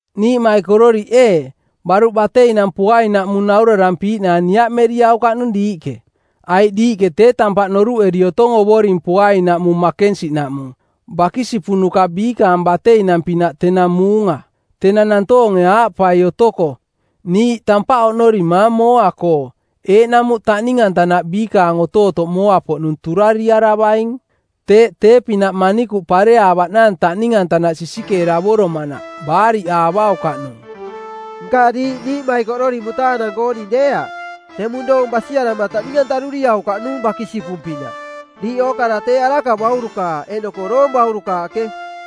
Niiꞌmaikororiꞌ ee, baruꞌ bateinang poainaꞌmung naurarampiiꞌnaang niaꞌmeriaukaꞌnung diiꞌke. Aiꞌ diiꞌke tee tampaꞌ noruꞌeri otong Ovoring poainaꞌmung makensiꞌnaꞌmung, bakisipunuka biikaang bateinang-pinaꞌ tenang muunga. Tenang nantoonge aaꞌpai otoko, “Niiꞌ tampaꞌ oꞌnorimaang mooa-koo,” eeꞌnamuꞌ taꞌning-antanaꞌ biikaang otootoꞌ mooa-poꞌnung turariaravaing. Teeꞌ tee-pinaꞌ manikuꞌ pareaavaꞌnaang taꞌning-antanaꞌ sisikeeravoromanaꞌ; baariꞌaavaukaꞌnung. Nka diiꞌ niiꞌmaikororiꞌ mutaanang-kooning deeaꞌ. Teꞌmung doong basiarama taꞌning-antaruriaukaꞌnung bakisipung-pinaꞌ. Diiꞌ ookara tee araka baurukaaꞌ eeꞌnoko doong baurukaaꞌke.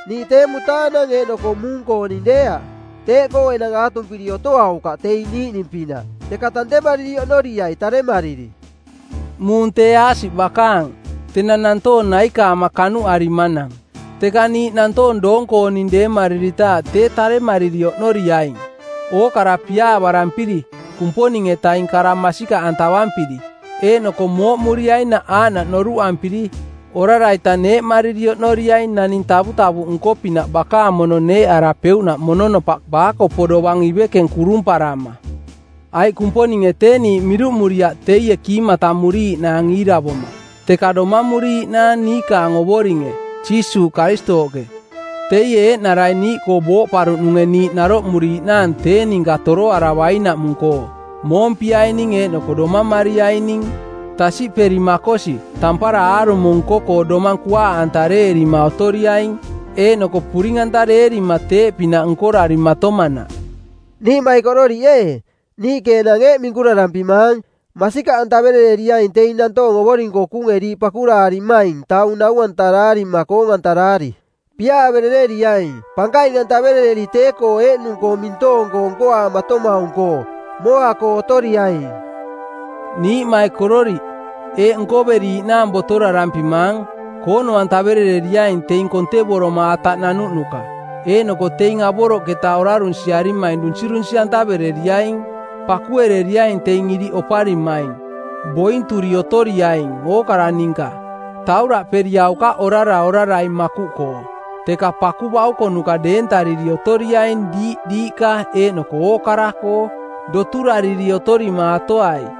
Niiꞌ tee mutaanang eeꞌnoko muung-kooning deeaꞌ. Teeꞌkoo enang aatumpiri otoaukaꞌ teing niiꞌning-pinaꞌ, teka tantemariri oꞌnoriai taremariri. Muung tee aasiꞌ bakanang, tenang nantoong naikaama kanuꞌarimanang. Teka niiꞌ nantoong doong-kooning deemariritaaꞌ tee taremariri oꞌnoriaing. Ookara piaavarampiri, Kumponing-etaing kara masikaꞌantavampiri, eeꞌnoko mooꞌmuriainaꞌ aaꞌnaꞌ noruꞌampiri, orara-ita neeꞌmariri oꞌnoriaing naning tavutavuꞌ nko-pinaꞌ bakaang mono neeꞌarapeuꞌnaꞌ mononopaꞌ baakopo dovang ivekeng kurumparama. Aiꞌ Kumponinge tee niiꞌ miruꞌmuriaꞌ teie kiimatamuriiꞌnaang iiravoma, teka domamuriiꞌnaang niikaang Ovoringe, Jiisuuꞌ Karistooꞌke, teie eeꞌnarai niiꞌkoo booꞌparuꞌnunge niiꞌ naroꞌmuriiꞌnaang tee ninka toroaravainaꞌmung-koo, moompiaining eeꞌnoko domamariaining. Tasiꞌperi? Makosi, tampara aarumo nko-koo domang kuaaꞌantareerima otoriaing, eeꞌnoko puring-antareerima teeꞌpinaꞌ nkorarimatomanaꞌ. Niiꞌmaikororiꞌ ee, niiꞌke enang eeꞌ minkurarampimaang: Masikaꞌantavereriaing teing nantoong Ovoring-koo kuunge diiꞌ pakuraarimaing taung nau-antaraarima koong-antaraari. Piaaverereriai, pankaing-antaverereri tee-koo eeꞌnung-koo mintoong-koo nkoaamatomaung-koo. Mooa-koo otoriaing. Niiꞌmaikororiꞌ, eeꞌ nkoveriiꞌnaang botorarampimaang: Koono-antaverereriaing teing kontevoroma ataꞌ nanuꞌnuka, eeꞌnoko teing avoroꞌketa orarunsiarimaing dunsirunsi-antavereriaing. Pakuereriaing teing iriꞌ oparimaing. Bointuri otoriaing ookara ninka. Tauraꞌperiaukaꞌ orara orarai makuꞌkoo, teka paku baukonuka deentariri otoriaing diiꞌ diiꞌka eeꞌnoko ookara-koo. Doturoturariri otorimaatoai.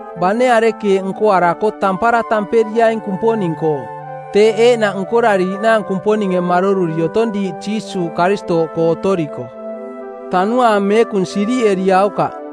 Bane arekeeꞌ nkoarako tampara tamperiaing Kumponing-koo. Teeꞌ eeꞌnaꞌ nkorariiꞌnaang Kumponinge maroruri otong diiꞌ Jiisuuꞌ Karistooꞌkoo otoriko. Tanuaang Meekung siriꞌeriaukaꞌ.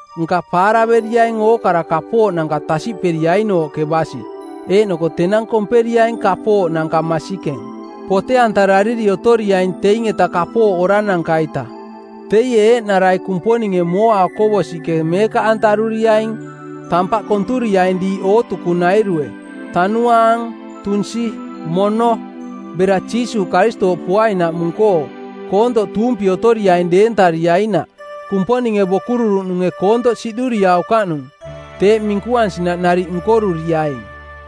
nka paaraveriaing ookara kapooꞌnanka tasiꞌperiainooꞌke basi, eeꞌnoko tenang komperiaing kapooꞌnanka masikeng. Pote-antarariri otoriaing teing-eta kapooꞌ orarananka-ita. Teie eeꞌnarai Kumponinge mooa okovosiꞌke meekaꞌantaruriaing, tampaꞌ konturiaing diiꞌ ootukunairue – tanuaang, tunsi, mono – bera Jiisuuꞌ Karistooꞌ poainaꞌmung-koo, koontoꞌ tuumpi otoriaing deentariainaꞌ. Kumponinge bokururuꞌnunge koontoꞌ siꞌduriaukaꞌnung. Teeꞌ minkuansinaꞌ nariꞌ nkoruriaing.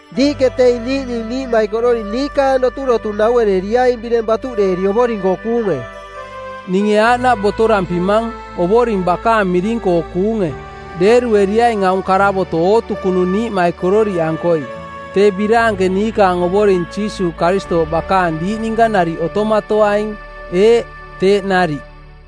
Diiꞌke teing niiꞌning niiꞌmaikororiꞌ niikaang doturotu nauereriaing bireng batuꞌdeeri Ovoring-koo kuunge. Ninge aaꞌnaꞌ botorampimang, Ovoring bakaang miring-koo kuunge: Deerueriaing aung karavoto˜ ootukunung niiꞌmaikororiꞌankoi. Tee biraanke niikaang Ovoring Jiisuuꞌ Karistooꞌ bakaang diiꞌ ninka nariꞌ otomatoaing. Eeꞌ, teeꞌ nariꞌ.